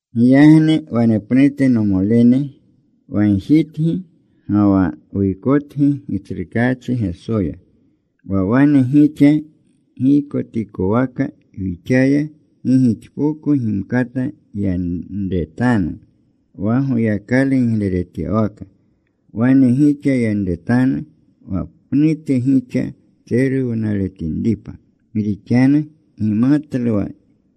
Giyagni wanepnute, nomolene, wagjitgi ga wa wuykotgi Gitsrukaachi Gesoya, wa wane gixa giykotikowaka wixaya gi gixpoko gimkata yanretanu wa Goyakalu gigleretyawaka, wana gixa yanretanu wa pnute gixa tseruwnaletinripa. Gi rixanu gimatlu wa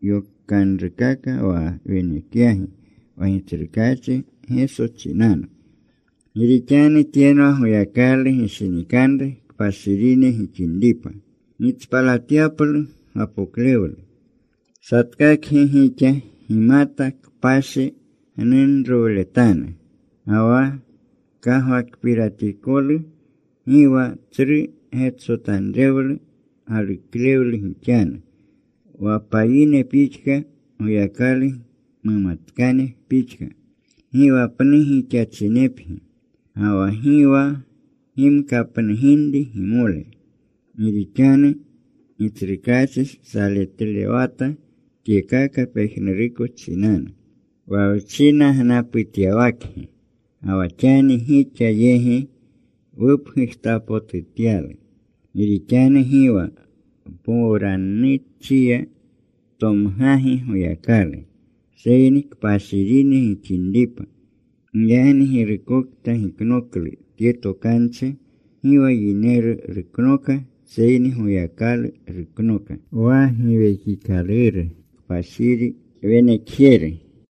yokanrukaka wa wenekyagi wa Gitsrukaachi Geso chinanu. Gi rixanu tyenwa Goyakalu gishinikanru kpashirine gixinripa, gitspalatyaplu gapoklewlu. Satkakgi gixa gimata kpashi gnunrowletanu ga wa kagwakpiratikolu. Gi wa tsru getsotanrewlu galuklewle gixanu, wa payine pixka Goyakalu mumatkane pixka. Gi wa pnu gixachinepgi, ga wa gi wa gimkapnuginri gimole. Gi rixanu Gitsrukaachi saletlewata tyekaka pejnuruko chinanu, wa wchinagnaputyawakgi, ga wa xani gixa yegi wupgujtapotutyalu. Gi rixanu gi wa mpowrannuchiya tomgagi Goyakalu, seyni kpashirine gixinripa. Giyagni girukokta giknoklu tye tokanchi, gi wa yineru ruknoka seyni Goyakalu ruknoka, wa Giwekikaluru Kpashiri wenekjeru.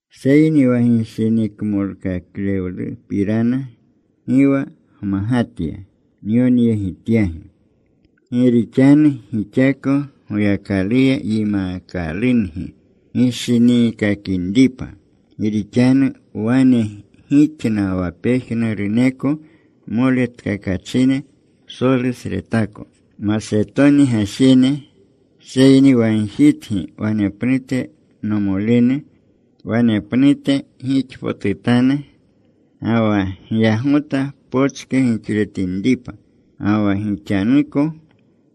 Seyni wa gishinikmolkaklewlupirana, gi wa gmagatya nyonyegityagi. Gi rixanu gixako Goyakaluya yimaakalungi gishiniikakinripa. Gi rixanu wane gixna wa pejnuruneko moletkakachine psolusretako Masetoni gajene. Seyni wagjitgi wanepnute nomolene, wanepnute gixpotutanu. Ga wa gyagota pochke gixletinripa. Ga wa gixanuko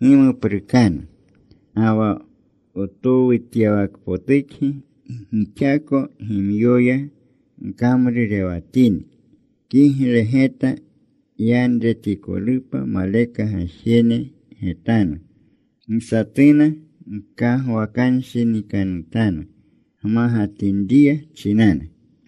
gimuprukanu. Ga wa wtowutyawakpotukgi gixako gimyoya gkamrurewatini. Kigle geta yanretikolupa maleka gajene getanu. Gi satuna gkagkwakanshinikanutanu gmagatinriya chinanu.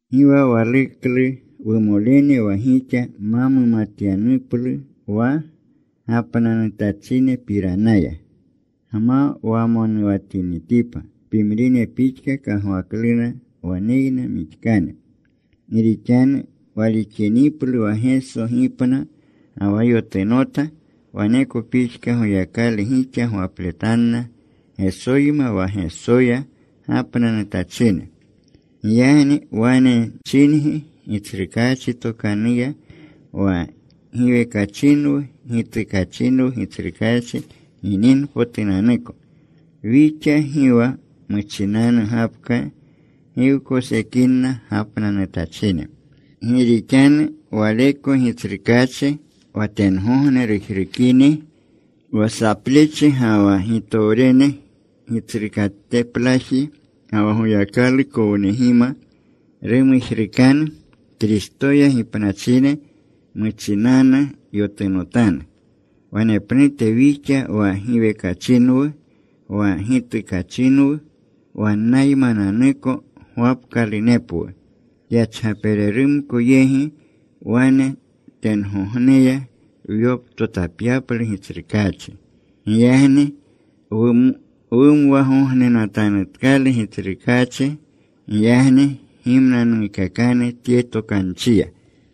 Gi wa waluklu, wumolene, wa gixa ma mumatyanuplu wa gapnanutachinepiranaya, gma wamonuwatinitipa pimrine pixka, kagwaklena waneyna mixkane. Gi rixanu walixiniplu wa Geso gipna ga wa yotunota, waneko pixka Goyakalu gixa gwapletanna Gesoyma wa Gesoya gapnanutachine. Giyagni wane wchingi Gitsrukaachi tokanuya wa giwekachinwu, gitukachinwu Gitsrukaachi gininpotunanuko, wixa gi wa muchinanu gapka gi wkosekinna gapnanutachine. Gi rixanu waleko Gitsrukaachi, wa tengogne rujrukini, wa saplechi, ga wa gitowrerune gitsrukateplaji, ga wa Goyakalu kownegima, rumujrukanu. Kristoya gipnachine muchinanu yotunotanu. Wanepnute wixa wa giwekachinwu wa gitukachinwu, wannaymananuko gwapkalunepwu kyachgapererumko yegi. Wane tengogneya wyoptotapyaplu Gitsrukaachi. Giyagni wumwagognenatanutkalu Gitsrukaachi. Giyagni gimnanuukakanu tye tokanchiya.